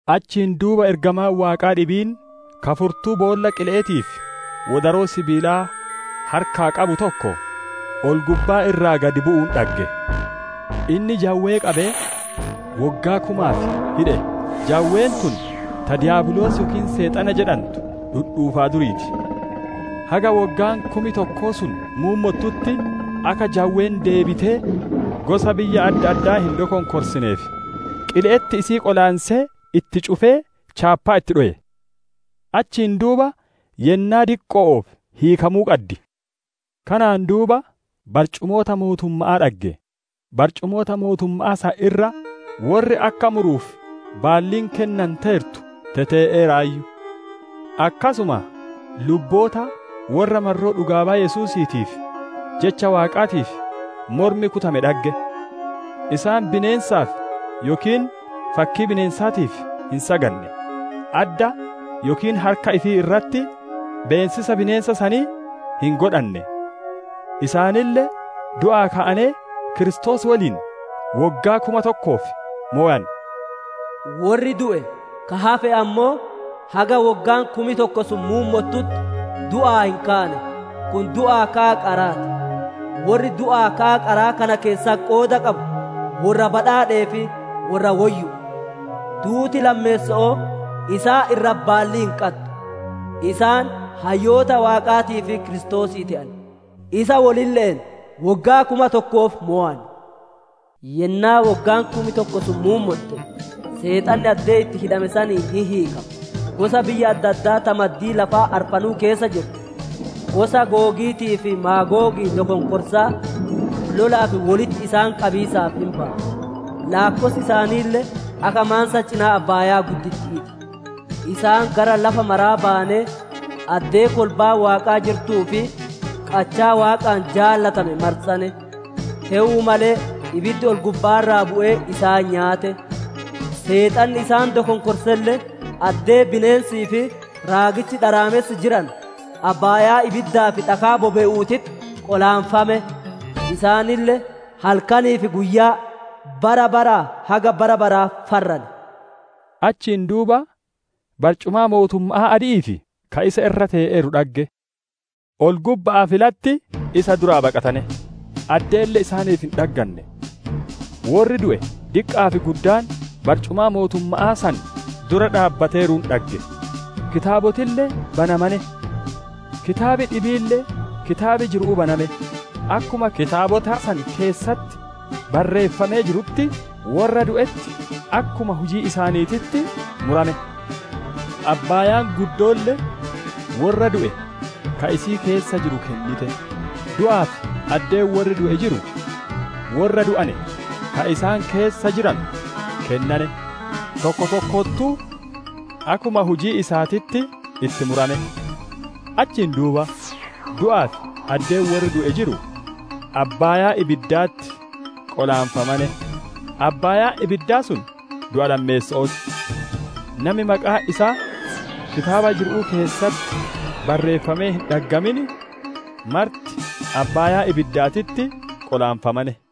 Achiin duuba ergamaan Waaqaa dhibiin, ka furtuu boolla qile'eetii fi wodaroo sibiilaa harkaa qabu tokko ol-gubbaa irraa gadi bu'uun dhagge. Inni jawwee qabee woggaa kumaaf hidhe; jawween tun ta Diyaabiloos yookiin Seexana jedhantu, dhudhuufaa durii ti. Haga woggaan kum tokko sun muummottutti, akka jawween deebitee gosa biyya adda addaa hin dokonkorsineef qile'etti isii qolaansee, itti cufee chaappaa itti dhowe. Achiin duuba yennaa diqqo'oof hiikamuu qaddi. Kanaan duuba barcumoota mootumma'aa dhagge; barcumoota mootumma'aa san irra worri akka muruuf baalliin kennanteertu tetee'eeraayyu. Akkasuma lubboota worra marroo dhugaa baya Yesuusiitii fi Jecha Waaqaatiif mormi kutamee dhagge. Isaan bineensaaf yookiin fakkii bineensaatiif hin saganne; adda yookiin harka ifii irratti beessisa bineensa sanii hin godhanne. Isaanille du'aa ka'anee Kiristoos woliin woggaa kuma tokkoof mowan. Worri du'e ka hafe ammoo, haga woggaan kum tokko sun muummotutti du'aa hin kaane. Kun du'aa ka'a qaraa ti. Worri du'aa ka'a qaraa kana keessatti qooda qabu worra badhaadhee fi worra woyyu'u. Duuti lammeesso'oo isaan irratti baallii hin qaddu; isaan hayyoota Waaqaatii fi Kiristoosii te'an; isa wolille'een woggaa kuma tokkoof mowan. Yennaa woggaan kum tokko sun muummotte, Seexanni addee itti hidhame sanii hin hiikama; gosa biyya adda addaa ta maddii lafaa arfanuu keessa jirtu: Gosa Googiitii fi Maagoogii dokonkorsaa, lolaaf wolitti isaan qabiisaaf hin baya; laakkossi isaaniille akka maansa cinaa abbaaya'aa ti. Isaan gara lafa maraa bayanee, addee kolbaan Waaqaa jirtuu fi qachaa Waaqaan jaalatame marsane; te'uu malee ibiddi ol-gubba'aa irraa bu'ee isaan nyaate. Seexanni isaan dokonkorselle, addee bineensii fi raagichi dharaamessi jiranu, abbaayaa ibiddaa fi dhakaa bobe'uutitti qolaanfame. Isaaniille halkanii fi guyyaa, bara baraa haga bara baraa farran. Achiin duuba barcumaa mootumma'aa adi'ii fi ka isa irra te'eeru dhagge. Ol-gubba'aa fi latti isa duraa baqatane; addeelle isaaniif hin dhagganne. Worri du'e diqqa'aa fi guddaan, barcumaa mootumma'aa san dura dhaabbateeruun dhagge; kitaabotille banamane. Kitaab dhibiille kitaab jiru'uu baname; akkuma kitaabota san keessatti barreeffamee jirutti, worra du'etti akkuma hujii isaaniititti murame. Abbaayaan guddoolle worra du'e ka isii keessa jiru kennite; du'aa fi addeen worri du'e jiru worra du'ane ka isaan keessa jiranu kennane; tokko tokkottuu akkuma hujii isaatitti itti murame. Achiin duuba du'aa fi addeen worri du'e jiru abbaayaa ibiddaatitti qolaanfamane; abbaayaan ibiddaa sun du'a lammeesso'oo ti. Nami maqaan isaa kitaaba jiru'uu keessatti bareeffamee hin dhaggamin marti abbaayaa ibiddaatitti qolaanfame.